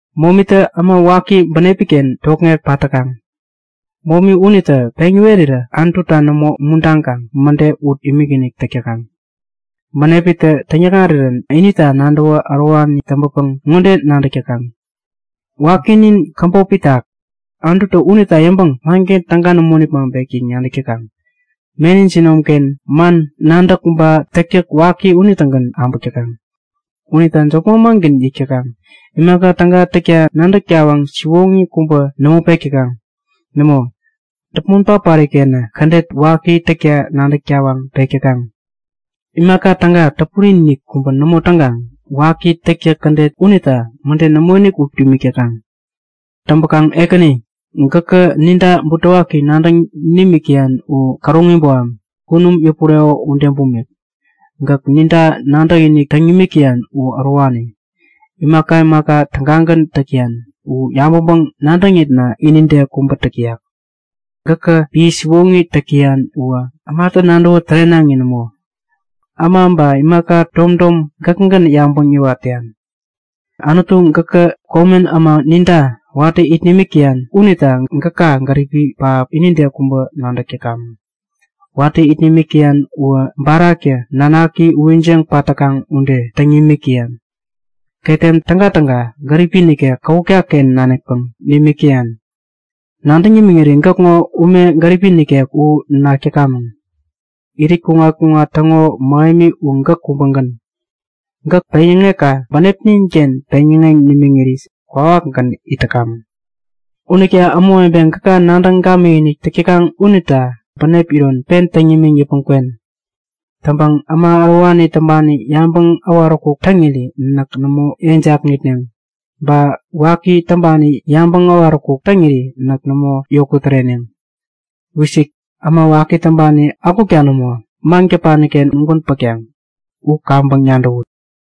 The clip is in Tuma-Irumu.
Momitä äma waki bänepiken tokŋek pat täkaŋ. Momi unitä peŋ yäwerirä Anututa nämo umuntaŋkaŋ mäde ut imikinik täk täkaŋ. Bänepitä täŋyäkŋarirän inita nadäwä ärowani täŋpäpäŋ ŋode nadäk täkaŋ; Wakinin käbop itak. Anututä unita yäŋpäŋ manken täga nämo nipmaŋpek! yäŋ nadäk täkaŋ. Meni jinomken man, nadäk ba täktäk waki unitägän abäk täkaŋ. Unita jop manmangän yäk täkaŋ. Imaka täga täkta nadäk tawaŋ siwoŋi kubä nämo pek täkaŋ. Nämo, däpmon patpari-kenä kädet waki täkta nadäk tawaŋ pek täkaŋ. Imaka täga täpuri-inik kubä nämo täŋkaŋ waki täktäk kädet unita mäde nämoinik ut imik täkaŋ. Täŋpäkaŋ Ekäni, gäkä ninta butewaki nadäŋ nimik täyan u käroŋi boham, kunum yäpureko ude bumik. Gäk ninta nadäkinik täŋ nimik täyan u ärowani. Imaka imaka tägagän täk täyan u yabäŋpäŋ-nadäŋitna inide kubä täk täyak. Gäkä piä siwoŋi täk täyan uwä ämatä nadäwä tärenaŋi nämo. Äma ba imaka tom tom gäkägän yabäŋ yäwat täyan. Anutu gäkä komen äma ninta watä it nimik täyan unita gäka gäripi pähap inide kubä nadäk täkamäŋ. Watä it nimik täyan uwä baraktä nanaki uwijiŋ pat täkaŋ ude täŋ nimik täyan. Ketem tägatäga gäripi nikek kawutkaken nanikpäŋ nimik täyan. Nadäŋ nimiŋiri gäkŋo ume gäripi nikek u nak täkamäŋ. Irit kuŋat-kuŋat täŋo mähemi u gäk kubägän. Gäk peŋyäŋekka bänepninken peŋyäŋeŋ nimiŋiri kwawakgän it täkamäŋ. Unita ämawebe gäka nadäŋ gamikinik täk täkaŋ unita bänep iron pen täŋ nimiŋ yäpmäŋ kwen. Täŋpäŋ äma ärowani täŋpani yabäŋ äwaräkuk täŋiri näk nämo yeŋ jakŋitneŋ. Ba waki täŋpani yabäŋ äwaräkuk täŋiri näk nämo yokut täreneŋ. Wisik! Äma waki täŋpani akukta nämo, maŋ-däpaniken ugän pätkaŋ. U kaŋpäŋ nadäwut!